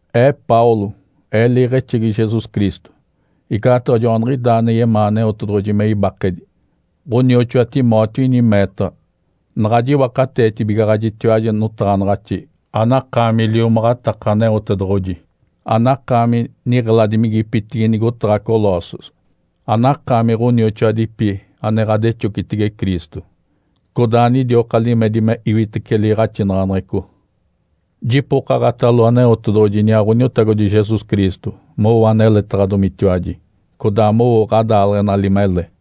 Ee Paulo, ee liiɡ̶exegi Jesus Cristo, igaataɡ̶a joaniɡ̶idaa ane yemaa Aneotedoɡ̶oji me ibakedi. Ǥonioxoa Timóteo ini meetaɡ̶a naɡ̶a jiwakateetibigaɡ̶ajitiwaji notaɡ̶anaɡ̶axi anakaami liomaɡ̶ataka Aneotedoɡ̶oji, anakaami niɡ̶eladimigipitigi nigotaɡ̶a Colossos, anakaami ɡ̶onioxoadipi ane ɡ̶adexocitege Cristo, codaa anidioka limedi me iwitece liiɡ̶axinaɡ̶aneɡ̶eco. Jipokaɡ̶atalo Aneotedoɡ̶oji iniaa Ǥoniotagodi Jesus Cristo mowo aneletaɡ̶adomitiwaji, codaa mowo ɡ̶adaaleɡ̶enali mele.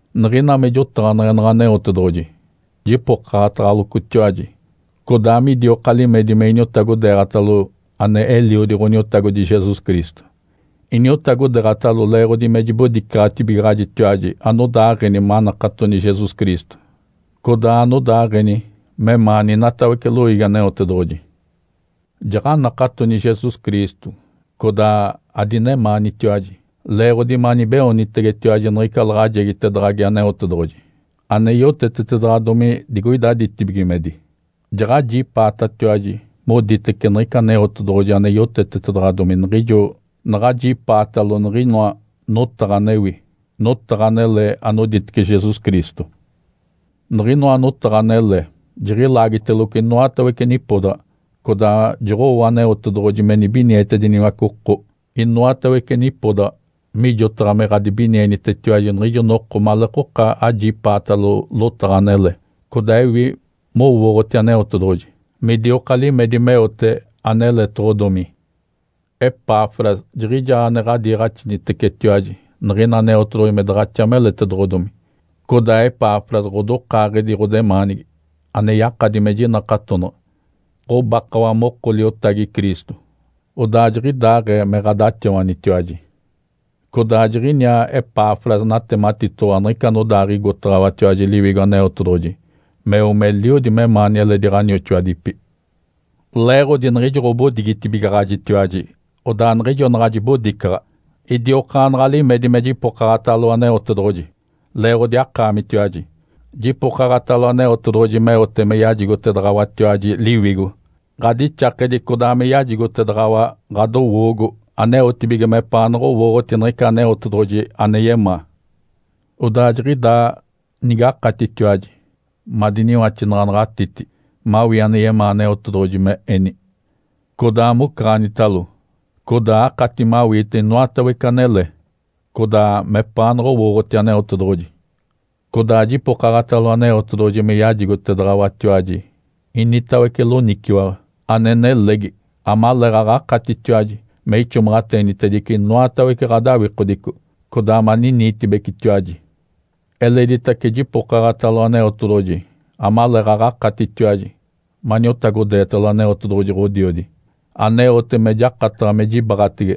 Niɡ̶ina me jotaɡ̶aneɡ̶enaɡ̶a Aneotedoɡ̶oji, jipokaɡ̶ataɡ̶alocotiwaji, codaa midioka limedi me iniotagodeeɡ̶atalo ane Eliodi Ǥoniotagodi Jesus Cristo, iniotagodeeɡ̶atalo leeɡ̶odi me jibodicaɡ̶atibigaɡ̶ajitiwaji anodaaɡ̶eni manakatoni Jesus Cristo, codaa anodaaɡ̶eni memaani inatawece loiigi Aneotedoɡ̶oji. Jaɡ̶anakatoni Jesus Cristo codaa adinemaanitiwaji leeɡ̶odi manibeoonitegetiwaji niɡ̶ica laɡ̶ajegitedaɡ̶agi Aneotedoɡ̶oji ane yotetetedaɡ̶adomi digoida ditibigimedi. Jaɡ̶ajipaatatiwaji moditece niɡ̶ica Aneotedoɡ̶oji ane yotetetedaɡ̶adomi niɡ̶ijo naɡ̶ajipaatalo niɡ̶inoa notaɡ̶a anewi, notaɡ̶a anele anoditece Jesus Cristo. Niɡ̶inoa notaɡ̶a anele jiɡ̶ilaagiteloco inoatawece nipodaɡ̶a codaa joɡ̶owo Aneotedoɡ̶oji me nibinietediniwace oko inoatawece nipodaɡ̶a, mijotaɡ̶a me ɡ̶adibinienitetiwaji niɡ̶ijo noko maleekoka ajipaatalo lotaɡ̶a anele, codaa ewi mowooɡ̶oti Aneotedoɡ̶oji midioka limedi meote aneletoɡ̶odomi. Epafras jiɡ̶ijaa ane ɡ̶adiiɡ̶axinitecetiwaji niɡ̶ina Aneotedoɡ̶oji me daɡ̶axa meletedoɡ̶odomi. Codaa Epafras ɡ̶odokaaɡ̶edi ɡ̶odemaanigi, ane yakadi me jinakatonaɡ̶a, ɡ̶obakawa moko liotagi Cristo, odaa jiɡ̶idaaɡ̶ee me ɡ̶adaxawanitiwaji. Codaa jiɡ̶iniaa Epafras natematitoɡ̶owa niɡ̶ica anodaaɡ̶igotaɡ̶awatiwaji Liwigo Aneotedoɡ̶oji meo meliodi memaani eledi ɡ̶onioxoadipi. Leeɡ̶odi niɡ̶ijo ɡ̶obodigitibigaɡ̶ajitiwaji, odaa niɡ̶ijo naɡ̶a jibodicaɡ̶a, idiokaanaɡ̶a limedi me jipokaɡ̶atalo Aneotedoɡ̶oji leeɡ̶odi akaamitiwaji. Jipokaɡ̶atalo Aneotedoɡ̶oji meote me yajigotedaɡ̶awatiwaji Liwigo ɡ̶adixakedi codaa me yajigotedaɡ̶awa ɡ̶adowoogo aneotibige mepaanaɡ̶a owooɡ̶oti niɡ̶ica Aneotedoɡ̶oji ane yemaa. Odaa jiɡ̶idaa nigakatitiwaji madiniwaxinaɡ̶anaɡ̶atiti mawii ane yemaa Aneotedoɡ̶oji me eni, codaa mocaɡ̶anitalo, codaa akati mawiite inoatawece anele, codaa mepaanaɡ̶a owooɡ̶oti Aneotedoɡ̶oji. Codaa jipokaɡ̶atalo Aneotedoɡ̶oji me yajigotedaɡ̶awatiwaji initawece loniciwaɡ̶a ane nelegi, amaleeɡ̶aɡ̶a akatitiwaji me ixomaɡ̶ateenitedice inoatawece ɡ̶adawikodico, codaa maniniitibecetiwaji. Eleditace jipokaɡ̶atalo Aneotedoɡ̶oji amaleeɡ̶aɡ̶a akatitiwaji maniotagodeetalo Aneotedoɡ̶oji Ǥodiodi, aneote me jakataɡ̶a me jibaɡ̶atege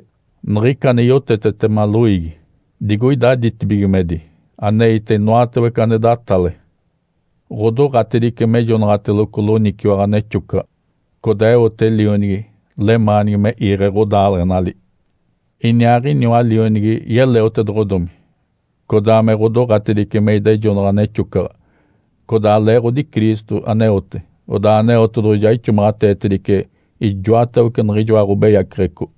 niɡ̶ica ane yotetetema loiigi digoida ditibigimedi aneite inoatawece ane datale. Ǥodoɡ̶atedice mejonaɡ̶ateloco loniciwaɡ̶a nexocaɡ̶a, codaa eote Lionigi lemaanigi me iiɡ̶e ɡ̶odaaleɡ̶enali. Iniaaɡ̶iniwa Lionigi yeleotedoɡ̶odomi, codaa me ɡ̶odoɡ̶atedice me idejonaɡ̶a nexocaɡ̶a. Codaa leeɡ̶odi Cristo aneote, odaa Aneotedoɡ̶oji ja ixomaɡ̶ateetedice ijoatawece niɡ̶ijoa ɡ̶obeyaceɡ̶eco.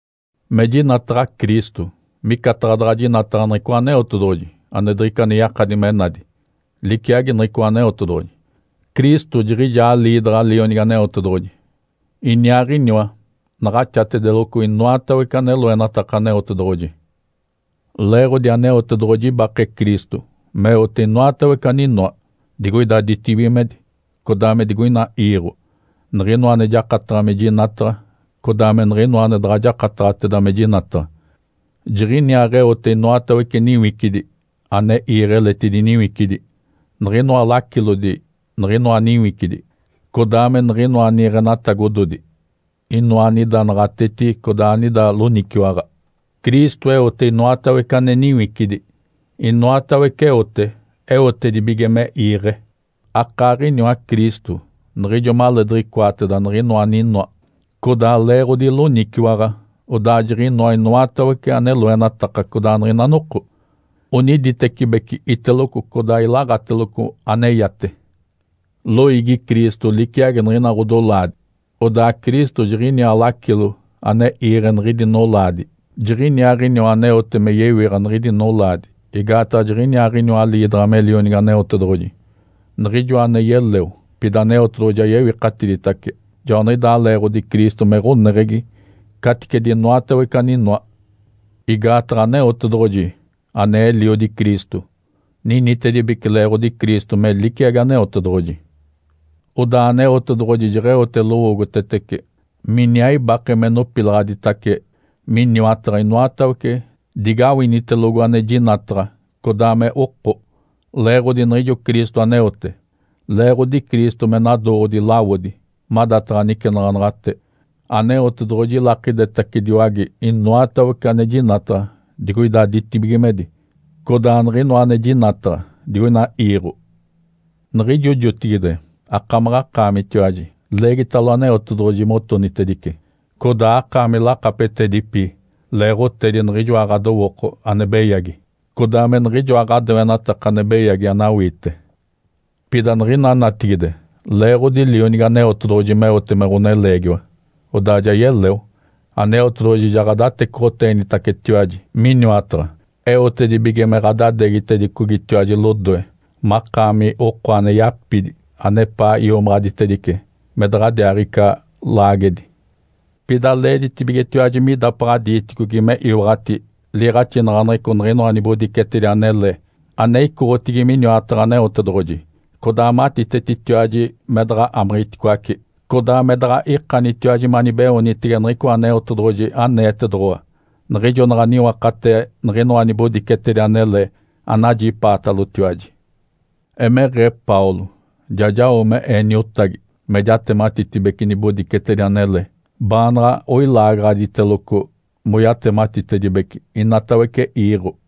Me jinataɡ̶a Cristo micataɡ̶a daɡ̶a jinataɡ̶a niɡ̶icoa Aneotedoɡ̶oji ane diɡ̶ica ane yakadi me nadi. Liciagi niɡ̶icoa Aneotedoɡ̶oji. Cristo jiɡ̶ijaa liidaɡ̶a Lionigi Aneotedoɡ̶oji. Iniaaɡ̶iniwa naɡ̶axatedeloco inoatawece ane loenataka Aneotedoɡ̶oji. Leeɡ̶odi Aneotedoɡ̶oji ibake Cristo meote inoatawece aninoa, digoida ditibigimedi, codaa me digoina iiɡ̶o, niɡ̶inoa ane jakataɡ̶a me jinataɡ̶a, codaa me niɡ̶inoa ane daɡ̶a jakataɡ̶ateda me jinataɡ̶a. Jiɡ̶iniaaɡ̶eote inoatawece niwicidi ane iiɡ̶e eletidi niwicidi, niɡ̶inoa lacilodi niɡ̶inoa niwicidi, codaa me niɡ̶inoa niiɡ̶enatagododi, inoa anida naɡ̶atetigi codaa anida loniciwaɡ̶a. Cristo eote inoatawece ane niwicidi. Inoatawece eote eotedibige me iiɡ̶e. Akaaɡ̶iniwa Cristo niɡ̶ijo maleediɡ̶icoateda niɡ̶inoa aninoa, codaa leeɡ̶odi loniciwaɡ̶a, odaa jiɡ̶inoa inoatawece ane loenataka codaa niɡ̶ina noko oniditecibeci iteloco codaa ilaɡ̶ateloco aneyate. Loiigi Cristo liciagi niɡ̶ina ɡ̶odolaadi. Odaa Cristo jiɡ̶iniaa lacilo ane iiɡ̶e niɡ̶idi nolaadi. Jiɡ̶iniaaɡ̶iniwa aneote me yewiɡ̶a niɡ̶idi nolaadi, igaataɡ̶a jiɡ̶iniaaɡ̶iniwa liidaɡ̶a me Lionigi Aneotedoɡ̶oji, Niɡ̶ijoa ane yeleo, pida Aneotedoɡ̶oji ja yewikatiditace. Joaniɡ̶idaa leeɡ̶odi Cristo me ɡ̶oneɡ̶egi caticedi inoatawece aninoa. Igaataɡ̶a Aneotedoɡ̶oji, ane Eliodi Cristo, ninitedibece leeɡ̶odi Cristo me liciagi Aneotedoɡ̶oji. Odaa Aneotedoɡ̶oji jeɡ̶eote lowoogotetece miniaa ibake me nopilaɡ̶aditace miniwataɡ̶a inoatawece digawinitelogo ane jinataɡ̶a codaa me oko, leeɡ̶odi niɡ̶ijo Cristo aneote. Leeɡ̶odi Cristo me nadooɡ̶odi lawodi madataɡ̶a nicenaɡ̶anaɡ̶ate, Aneotedoɡ̶oji ilakidetacediwage inoatawece ane jinataɡ̶a digoida ditibigimedi, codaa niɡ̶inoa ane jinataɡ̶a digoina iiɡ̶o. Niɡ̶ijo jotigide akamaɡ̶akaamitiwaji leegitalo Aneotedoɡ̶oji motonitedice. Codaa akaami lakapetedipi leeɡ̶otedi niɡ̶ijoa ɡ̶adowooko ane beyagi, codaa me niɡ̶ijoa ɡ̶adoenataka ane beyagi anawiite. Pida niɡ̶ina natigide, leeɡ̶odi Lionigi Aneotedoɡ̶oji meote me ɡ̶oneleegiwa, odaa ja yeleo, Aneotedoɡ̶oji ja ɡ̶adatecoɡ̶oteenitacetiwaji miniwataɡ̶a, eotedibige me ɡ̶adadeegitedicogitiwaji lodoe, makaami oko ane yapidi, anepaa iomaɡ̶aditedice, me daɡ̶adiaaɡ̶ica laagedi. Pida leeditibigetiwaji me idapaɡ̶a diiticogi me iwaɡ̶ati liiɡ̶axinaɡ̶aneɡ̶eco niɡ̶inoa nibodicetedi anele ane icoɡ̶otigi miniwataɡ̶a Aneotedoɡ̶oji, codaa matitetitiwaji me daɡ̶a amiɡ̶iticoace, codaa me daɡ̶a ikanitiwaji manibeoonitege niɡ̶icoa Aneotedoɡ̶oji aneetedoɡ̶owa niɡ̶ijo naɡ̶a niwakatee niɡ̶inoa nibodicetedi anele anajipaatalotiwaji. Emeɡ̶ee Paulo, ja jao me ee niotagi me jatematitedibece nibodicetedi anele, baanaɡ̶a oilaagaɡ̶aditedeloco moyatematitedibece inatawece iiɡ̶o.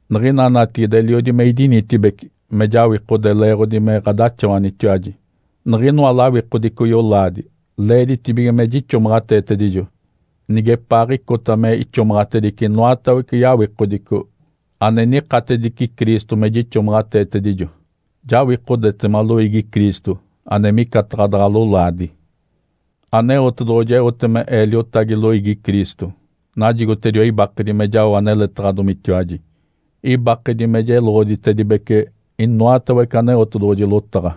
Niɡ̶ina natigide eliodi me idinitibeci me jawikode leeɡ̶odi me ɡ̶adaxawanitiwaji. Niɡ̶inoa lawikodico yolaadi, leeditibige me jixomaɡ̶ateetedijo, nigepaaɡ̶icota me ixomaɡ̶atedice inoatawece yawikodico ane nikatedici Cristo me jixomaɡ̶ateetedijo. Jawikodetema loiigi Cristo ane micataɡ̶a daɡ̶a lolaadi. Aneotedoɡ̶oji eote me ee liotagi loiigi Cristo. Najigotediwa ibakedi me jao aneletaɡ̶adomitiwaji. Ibakedi me jeloɡ̶oditedibece inoatawece Aneotedoɡ̶oji lotaɡ̶a.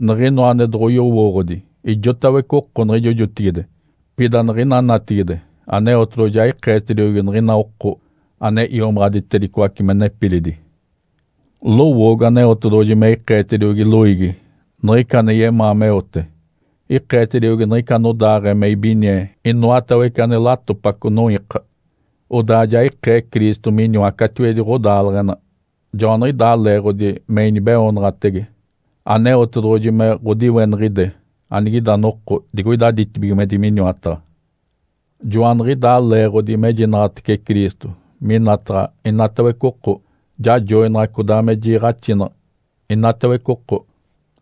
Niɡ̶inoa ane doɡ̶oyowooɡ̶odi ijotawece oko niɡ̶ijo jotigide, pida niɡ̶ina natigide Aneotedoɡ̶oji ja ikeetediogi niɡ̶ina oko ane iomaɡ̶aditedicoace me nepilidi. Lowoogo Aneotedoɡ̶oji me ikeetediogi loiigi niɡ̶ica ane yemaa meote. Ikeetediogi niɡ̶ica anodaaɡ̶ee me ibinie inoatawece ane latopaco noiika. Odaa ja ikee Cristo miniwa catiwedi ɡ̶odaaleɡ̶ena. Joaniɡ̶idaa leeɡ̶odi me inibeoonaɡ̶atege Aneotedoɡ̶oji me ɡ̶odiweniɡ̶ide anigida noko digoida ditibigimedi miniwataɡ̶a. Joaniɡ̶idaa leeɡ̶odi mejinaɡ̶atece Cristo minataɡ̶a inatawece oko. Jajoinaɡ̶a codaa me jiiɡ̶axinaɡ̶a inatawece oko,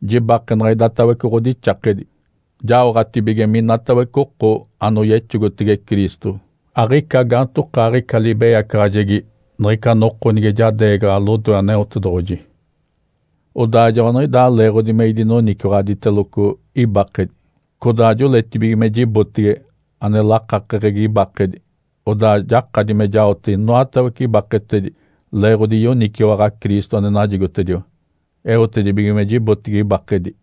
jibakenaɡ̶a idatawece ɡ̶odixakedi, jaoɡ̶atibige minatawece oko anoyexogotege Cristo aɡ̶ica gaantokaaɡ̶ica libeyacaɡ̶ajegi niɡ̶ica noko nige jadeegaɡ̶a lodoe Aneotedoɡ̶oji. Odaa joaniɡ̶idaa leeɡ̶odi me idinoniciwaɡ̶aditeloco ibakedi, codaa joletibige me jibotege ane lakakeɡ̶egi ibakedi. Odaa jakadi me jaote inoatawece ibaketedi leeɡ̶odi yoniciwaɡ̶a Cristo ane najigotediwa, eotedibige me jigodi ibakedi.